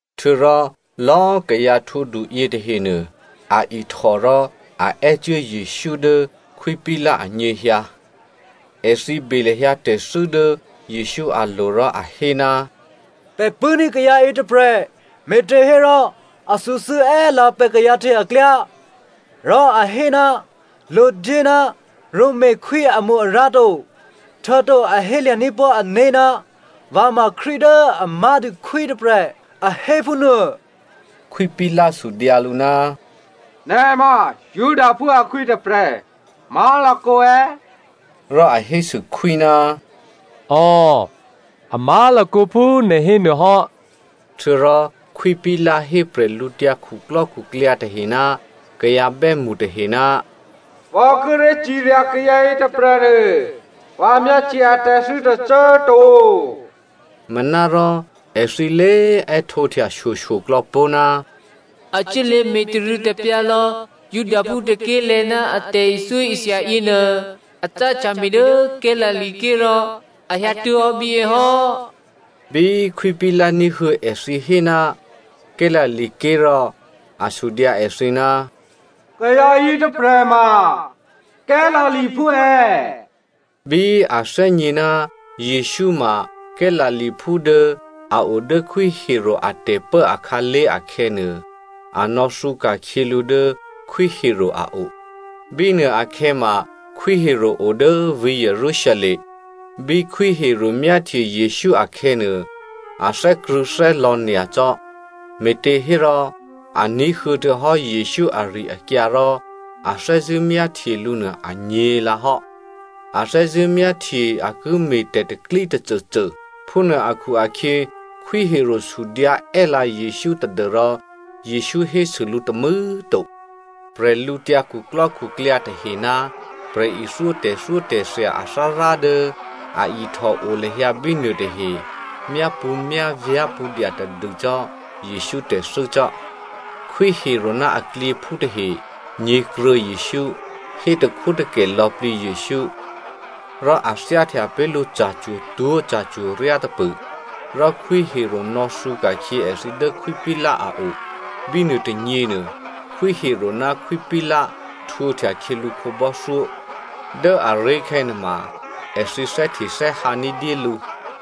Htuô̌rò lò̌꤮ kayǎ htwǒdu yětahenuô, a ihtò rò a è́cuố Jesǔ dố Khwí Pilato anyěhyǎ. Èthǐ be lahyǎ tè̤thû́ dố Jesǔ alo̤ rò a hé, “Pè̤ pṳ̂́ní̤ kayǎ yětôprè̤, me̤těhérò a thǔthû́ è́lǎ pè̤ kayǎ tahe aklyá, rò a hé ná lodyé ná Romakhwí amo-arǎ to, htuô̌to a hélya̤ní̤ pó̤ ané̤ ná vǎ ma Krístu dố a má̤dû khwí tôprè̤, a hé phúnuô.” Khwí Pilato sudyǎ lǔ, “Nè̤ ma Judaphú akhwí tôprè̤ má̤lakǒ è̌?” Rò a hésû khwí, “Ò, a má̤lakǒ phú nè̤ hénuô hò́.” Htuô̌rò Khwí Pilato hé bwídukhu tahe ná kayǎ bè́mṳ tahe, “Vǎ kíré̤ cirya kayǎ yětôprè̤nuô, vǎ myáhtye atè̤thû́ tôcô꤮ to.” Manárò, èthǐ lé è́htǒhtya shyoshyoklò̌ pó̤, “A cuốlě me̤tarû̌tapyǎ lò̌ Judaphú tôké̤lè̤̌ ná a tè̤ithyóithya yěnuô. A cáhtya me̤ dố Galilea ké̤ rò a hyǎtuố̤hò́ bíyě hò́.” Bí Khwí Pilato ní̤huô̌ èthǐ hé ná Galilea ké̤, rò a sudyǎ èthǐ, “Kayǎ yětôprè̤ ma Galileaphú è̌?” Bí a thè́gně ná Jesǔ ma Galileaphú dố a o dố Khwí Herodè atè̤pố akhǎlé̤ akhè̌nuô, a nò̌thǔka̤khyě lǔ dố Khwí Herodè a o. Bínuôakhè̌ ma Khwí Herodè o dố vǐ̤ Jerusalem. Bí Khwí Herodè myáhtye Jesǔ akhè̌nuô, a thè́krṳ̂̌thè́lò̌ nyacò́, me̤těhérò a ní̤huô̌ htuô̌hò́ Jesǔ ari-akyǎ rò a thè́zṳ̂́ myáhtye lǔ nuô anyě̤lǎhò́. A thè́zṳ̂́ myáhtye a ki me̤ tè̤pro̤tè̤prya̤ tôcôcô. Phúnuô akhu-akhyě Khwí Herodè sudyǎ è́lǎ Jesǔ tadû́rò Jesǔ hésû lǔ tômû̌꤮ to. Bwídukhu tahe ná prè̤ithyó tè̤thyótè̤thya athárá dố a ihtòo lahyǎ bínuô tahe, myápṳ̌myávyá̤ pṳ̌ dya tadû cò́ Jesǔ tè̤thû́ cò́. Khwí Herodè ná aklyěphú tahe nyě̤kruô̌ Jesǔ, hétakhwótakè lò̌plǐ Jesǔ, rò a thyáhtya pé̤ lǔ ca̤cwo̤twó̤ ca̤cwo̤ryá tôpṳ̂, rò Khwí Herodè nò̌thǔ ka̤khyě èthǐ dố Khwí Pilato a o. Bínuôtônyěnuô, Khwí Herodè ná Khwí Pilato htwǒhtya khyělǔ khǒbò́thyó. Dố aré̤khè̌ nuôma èthǐ thè́htethè́hǎ ní̤dyé lǔ.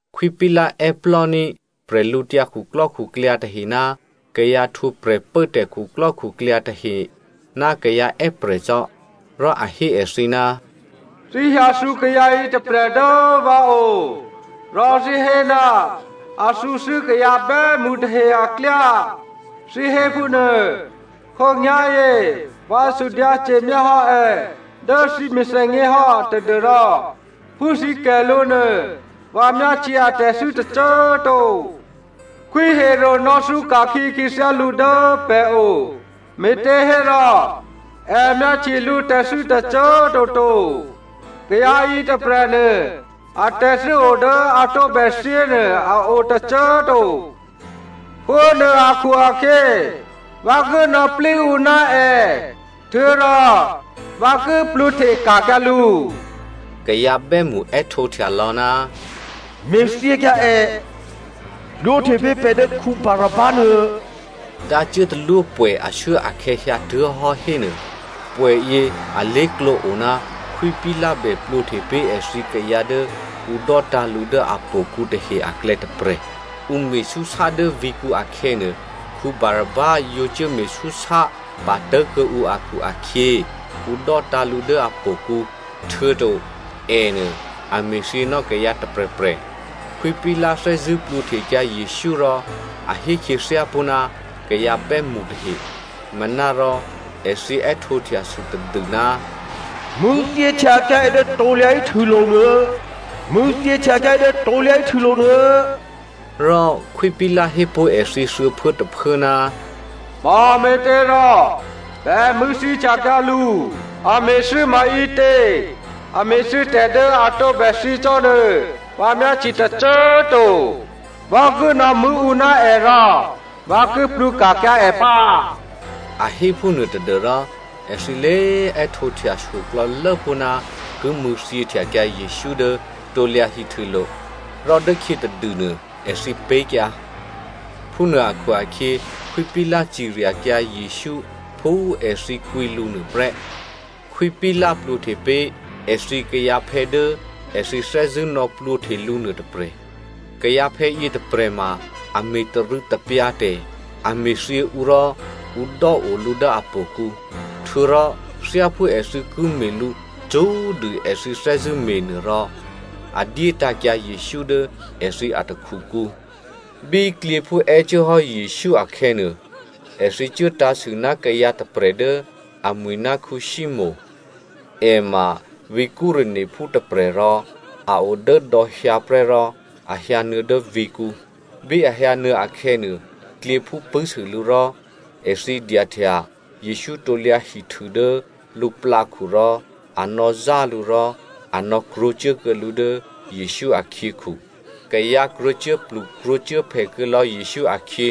Khwí Pilato è́plò́ní̤ bwídukhu tahe ná kayǎ htwǒ prè̤pốtè̤ khuklò́khuklyǎ tahe ná kayǎ è́prè̤ cò́. Rò a hé èthǐ, “Thǐ hyǎthǔ kayǎ yětôprè̤ dố vǎ o, rò thǐ hé ná a thǔthû́ kayǎ bè́mṳ tahe aklyá, thǐ hé phúnuô. Khǒnyá̤yě vǎ sudyǎce̤myá hò́ è dố thǐ mèthènyě hò́ tadû́rò phú thǐ kè̤ lǔ nuô, vǎ myáhtye atè̤thû́ tôcô꤮ to. Khwí Herodè nò̌thǔka̤khyě khyěthyá lǔ dố pè̤ o me̤těhérò è myáhtye lǔtè̤thû́ tôcô꤮ toto. Kayǎ yětôprè̤nuô, atè̤thû́ o dố a tǒbè thyěnuô a o tôcô꤮ to. Phúnuô akhu-akhyě, vǎ ki nò̌plí ǔ ná è, htuô̌rò vǎ ki plwǒhteka̤kyǎ lǔ.” Kayǎ bè́mṳ è́htǒhtya lò̌, “Me̤thyěkyǎ è, plwǒhte pé̤ pè̤ dố Barabba nuô.” Dǎ cuốtalwópwè̌ ashuốakhè̌ hyǎtuố̤hò́ hénuô, pwè̌yě alé̤klǒ o ná Khwí Pilato bè plwǒhte pé̤ èthǐ kayǎ dố ǔ dò́tǎ̤ lǔ dố htò̌kǔ tahe aklè̌ tôprè̤. (Ǔ me̤súsá dố vǐ̤kǔ akhè̌nuô, Barabba yǒ cuốme̤súsá patố̤kuô̌ǔ akhu-akhyě, ǔ dò́tǎ̤ lǔ dố htò̌kǔ, htuô̌to ènuô a me̤thyěnò́ kayǎ tôprè̤prè̤.) Khwí Pilato thè́zṳ̂́ plwǒhtekyǎ Jesǔ rò a hé khyěthyápó̤ ná kayǎ bè́mṳ tahe, manárò èthǐ è́htǒhtyasû tadû, “Mṳ̂̌thyěhtyakyǎ è dố krusulo̤ nuô! Mṳ̂̌thyěhtyakyǎ è dố krusulo̤ nuô!” Rò Khwí Pilato hépó̤ èthǐ thuô̌phuốtôphuố, “Mame̤těrò bè mṳ̂̌thyěhtyakyǎ lǔ? A me̤thû́ maǐtě? A me̤thû́tè̤ dố a tǒbè thyě cò́ nuô, vǎ myáhtye tôcô꤮ to. Vǎ ki nò̌mṳ̂̌ ǔ ná è rò vǎ ki plwǒka̤kyǎ è pǎ.” A hé phúnuô tadû́rò èthǐ lé꤮ è́htǒhtyashyo klò̌lố pó̤ ná ki mṳ̂̌thyěhtyakyǎ Jesǔ dố krusulo̤. Rò dốkhyětadûnuô, èthǐ pé̤kyǎ. Phúnuô akhu-akhyě, Khwí Pilato ciryakyǎ Jesǔ phú èthǐ kwǐ lǔ nuô prè́. Khwí Pilato plwǒhte pé̤ èthǐ kayǎphè̌ dố èthǐ thè́zṳ̂́ nò̌plwǒhte lǔ nuôtôprè̤. Kayǎphè̌ yětôprè̤ ma a me̤tarû̌tapyǎ tè̤, a me̤thyě ǔ rò ǔ dò́o lǔ dố htò̌kǔ. Htuô̌rò thyáphú èthǐ ki me̤ lǔ cṳ́꤮ dû èthǐ thè́zṳ̂́ me̤nuô rò a dyétǎ̤kyǎ Jesǔ dố èthǐ atakhukǔ. Bí klyěphú è́cuốhò́ Jesǔ akhè̌nuô, èthǐ cuốtǎ̤sû ná kayǎ tôprè̤ dố amwi̤ ná Simonè. È ma vǐ̤ Cyreneophú tôprè̤, rò a o dố dò̌ hyǎ prè́ rò a hyǎnuô̌ dố vǐ̤kǔ. Bí a hyǎnuô̌ akhè̌nuô, klyěphú pṳ̂́sû lǔ rò èthǐ dyahtya Jesǔ krusu dố lǔplǎkhu, rò a nò̌zá lǔ rò a nò̌krwǒcuố kuô̌ lǔ dố Jesǔ akhyěkhu. Kayǎ krwǒcuốplu krwǒcuốphè kuô̌lò̌ Jesǔ akhyě,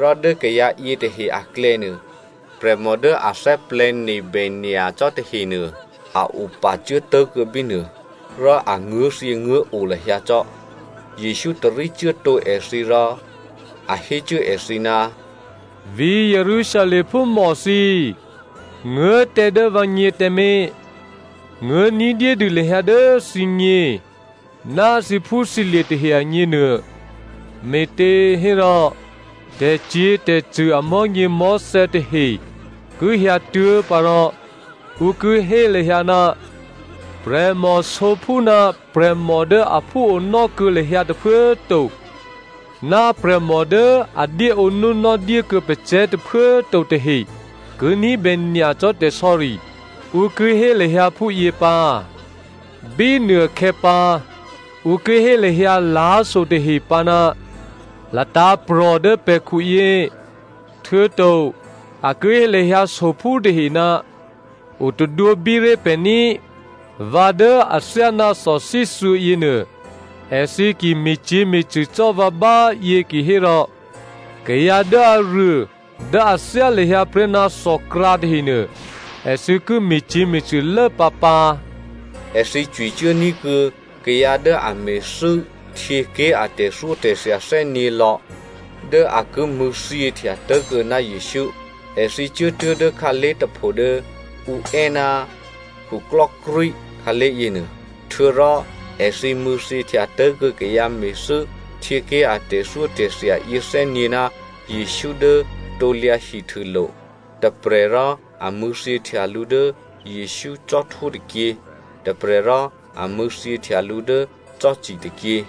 rò dố kayǎ yětahe aklè̌nuô, prè̤mò dố a thè́plè̤̌nebè nyacò́ tahenuô, a opacuốtố̤kuô̌ bínuô, rò a nguố̤thyěnguố̤o lahyǎ cò́. Jesǔ tarícuố tǒ èthǐ rò a hécuố èthǐ, “Vǐ̤ Jerusalem phúmò thǐ꤮, nguố̤ tǎ dố vǎgně tǎmé̤, nguố̤ ní̤dyédû lahyǎ dố thǐgně ná thǐphúthǐlye̤ tahe agněnuô. Me̤těhérò, tè̤cyě̤tè̤cṳ̂ amò̤́nyěmò̤́thè̌ tahe ki hyǎtuố̤ pǎ rò ǔ ki hé lahyǎ, ‘Prè̤mòsǒphú ná prè̤mò dố aphú onò́ kuô̌ lahyǎ tôphuố꤮ to, ná prè̤mò dố a dyéǒnúnò́ dyé kuô̌ pacè̤̌ tôphuố꤮ to tahe ki ní̤bè nyacò́ tè̤sò̌ri!’ Ǔ ki hé lahyǎ phúyě pǎ. Bínuôkhè̌pǎ ‘Ǔ ki hé lahyǎ lá̤so tahe pǎ, “Latǎ̤prò̤ dố pè̤khuyě!” Htuô̌to a ki hé lahyǎ sophú tahe, “O tadwǒbíré̤ pè̤ ní꤮!”’ “Vǎ dố athyáná thòthíthuô̌ yěnuô, èthǐ ki me̤cyě̤me̤cṳ̂ cò́ vǎ báyě kihérò, kayǎ dố aruô dố a thyá lahyǎ prè́ ná thòkrǎ tahenuô, èthǐ ki me̤cyě̤me̤cṳ̂lố pǎpǎ.” Èthǐ cwicuốní̤ kuô̌ kayǎ dố a me̤thû́ htyěké̤ a tè̤thyótè̤thya thè́nyě̤lò̌ dố a ki mṳ̂̌thyěhtya tố̤kuô̌ ná Jesǔ. Èthǐ cuốtuố̤ dố khǎlé̤ tôpho dố ǔ è́, “khuklò́krwí” khǎlé̤ yěnuô. Htuô̌rò èthǐ mṳ̂̌thyěhtya tố̤kuô̌ kayǎ me̤thû́ htyěké̤ a tè̤thyótè̤thya yěthè́nyě̤ ná Jesǔ dố krusulo̤. Tôprè̤ rò a mṳ̂̌thyěhtya lǔ dố Jesǔ cò́htwó tôkyě, tôprè̤ rò a mṳ̂̌thyěhtya lǔ dố cò́ci tôkyě.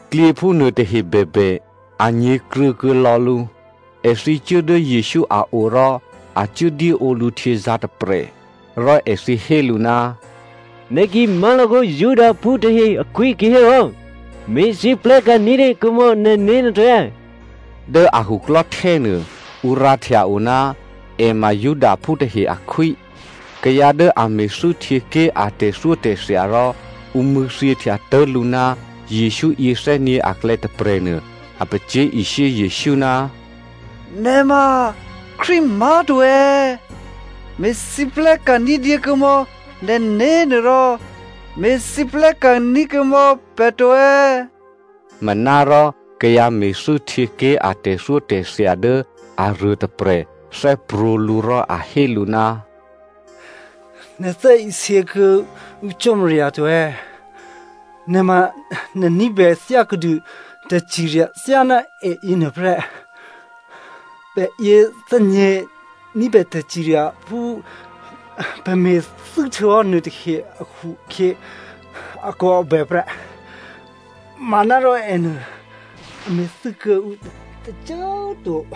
Klyěphú nuôtahe bèbè, a nyě̤kruô̌ kuô̌ lò̌ lǔ. Èthǐ cuố dố Jesǔ a o rò a cuốdyéǒ lǔ htyězǎ̤taprè. Rò èthǐ hé lǔ, “Nè̤ ki má̤lakǒ Judaphú tahe akhwí kihérò me̤lwóhteka̤ ní̤dyé kuô̌mò̌ nè̤né̤ nuô to.” Dố a khuklò́htè́nuô, ǔ rǎhtya o, “È ma Judaphú tahe akhwí.” Kayǎ dố a me̤thû́ htyěké̤ a tè̤thyótè̤thya rò ǔ mṳ̂̌thyěhtya tố̤ lǔ ná Jesǔ yěthè́nyě̤ aklè̌ tôprè̤ nuô a pacyé̤ishyé Jesǔ, “Nè̤ ma Krístu má̤to è̌? Me̤lwóhteka̤ ní̤dyé kuô̌mò̌ nè̤né̤nuô, rò me̤lwóhteka̤ kuô̌mò̌ pè̤ to!” Manárò kayǎ me̤thû́ htyěké̤ a tè̤thyótè̤thya dố aruôtôprè̤ thè́prwǒ̤ lǔ rò a hé lǔ, “Nè̤ thè́isě kuô̌ǔ Cò́marya to è̌? Nè̤ ma nè̤ ní̤bè thyákuô̌dû tè̤cirya thyáná è yěnuô prè́. Pè̤ yěthè́nyě̤ ní̤bè tè̤cirya phú pè̤ me̤thû́htuô̌hò́ nuôtahe akhu-akhyě akòabè prè́. Manárò ènuô, a me̤thû́ kuô̌ǔ tôcô꤮ to.”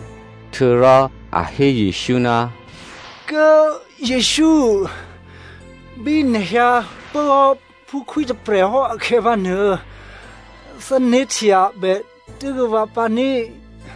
Htuô̌rò a hé Jesǔ, “Kố꤮ Jesǔ꤮, bí nè̤ hyǎpốhò́ phú khwí tôprè̤ hò́ akhè̌pǎnuô, thè́né̤htyabè tuố̤kuô̌ vǎ pǎ ní꤮.”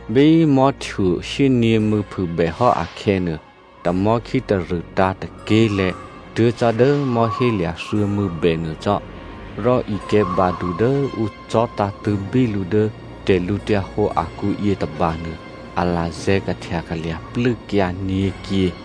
Bí mò̤́htuô shyényě̤mû̌ phûbèhò́ akhè̌nuô, tamò̤́ khítarṳ̂tǎ̤ tôké̤lè̤̌ tuố̤ cò́ dố mò̤́hélya̤ thuô̌mû̌ bè nuô cò́. Rò ikè̤̌badu dố ǔ cò̤́tǎ̤tṳ̂̌bí lǔ dố tè̤lǔhǒdu akǔ yětôbanuô, a lazè̤̌ kahtyakalya̤ plû́kyǎ nyě̤kyě.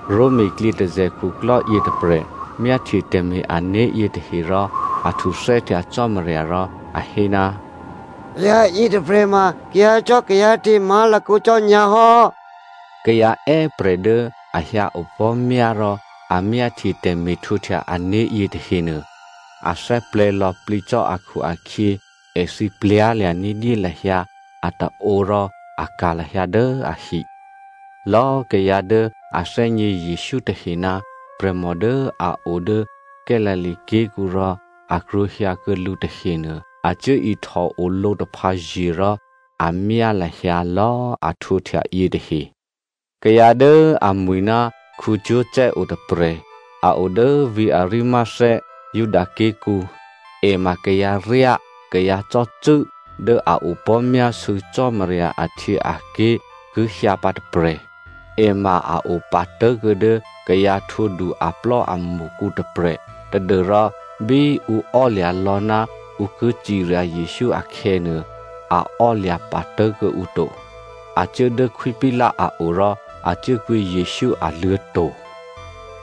Roma klyětôzè̤ khuklò́ yětôprè̤ myáhtye tè̤me̤-ané̤ yětahe rò a htuthè́htya Cò́marya rò a hé, “Kayǎ yětôprè̤ ma kayǎcò́kayǎte̤ má̤lakǒ cò́ nyǎ hò́!” Kayǎ è́prè̤ dố a hyǎ opò̤́myá rò a myáhtye tè̤me̤htwǒhtya ané̤ yětahenuô, a thè́plè̤̌ lò̌plǐ cò́ akhu-akhyě èthǐ htòlya̤ ní̤dyé lahyǎ ataǒ rò a ka̤ lahyǎ dố ahi. Lò̌꤮ kayǎ dố a thè́gně Jesǔ tahe ná prè̤mò dố a o dố Galilea ké̤kǔ rò a krwǒ hyǎkuô̌ lǔ tahenuô, a cuố ihtòo lǒtaphǎye̤ rò a myá lahyǎ lò̌꤮ a htwǒhtya yětahe. Kayǎ dố amwi̤ ná Joseph o tôprè̤. A o dố vǐ̤ Arimathea, Juda ké̤kǔ. È ma kayǎryá, kayǎcò́cû́ dố a opò̤́myásû̌ Cò́marya ahtyěaké̤ ki hyǎ pǎ tôprè̤. È ma a opatố̤kuô̌ dố kayǎ htwǒdu aplò́amṳkǔ tôprè̤ tadû́rò bí ǔ ò́lya̤ lò̌ ná ǔ ki cirya Jesǔ akhè̌nuô, a ò́lya̤ patố̤ kuô̌ǔ to. A cuố dố Khwí Pilato a o rò a cuốkwǐ Jesǔ aluô̤̌to̤.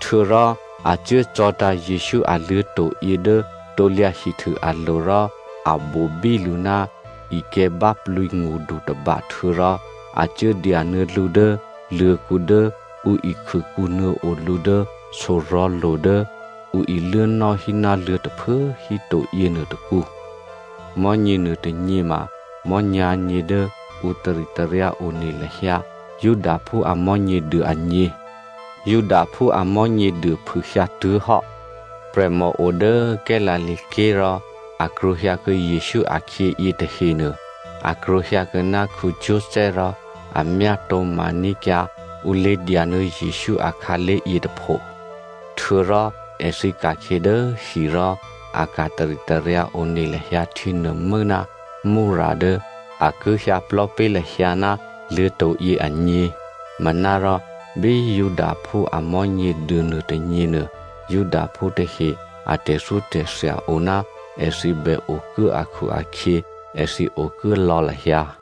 Htuô̌rò a cuố cò̤̌tǎ̤ Jesǔ a luô̤̌to̤yě dố krusu alo̤ rò a bobí lǔ ná ikè̤̌báplǐ ngṳdu tôba htuô̌rò a cuốdyanuô̌ lǔ dố luô̤̌kǔ dố ǔ ikhûkǔnuô̌ o lǔ dố sorò̤̌lo̤ dố ǔ iluốnò́ hí ná luô̤̌ tôphuố híto yěnuô tôkǔ. Mò̤́nyě nuôtônyě ma mò̤́nyǎ̤nyě dố ǔ taritaryǎ one lahyǎ Judaphú a Mò̤́nyěduô agně. Judaphú a Mò̤́nyěduô phûhyǎtuố̤hò́. Prè̤mò o dố Galilea ké̤ rò a krwǒhyǎkuô̌ Jesǔ akhyě yětahenuô, a krwǒhyǎkuô̌ ná Joseph rò a myátǒ̤ma ní̤kyǎ ǔ lé̤dyanuô̌ Jesǔ akhǎlé̤ yětôpho. Htuô̌rò èthǐ ka̤khyě dố hi rò a ka̤ taritaryǎ one lahyǎ htyěnuô̤mû́ ná myrra dố a ki hyǎ plò̤́ pé̤ lahyǎ ná luô̤̌to̤yě agně. Manárò bí Judaphú a Mò̤́nyěduô nuôtônyěnuô, Judaphú tahe a tè̤thyótè̤thya o ná èthǐ bè okuố akhu-akhyě, èthǐ okuố lò̌ lahyǎ.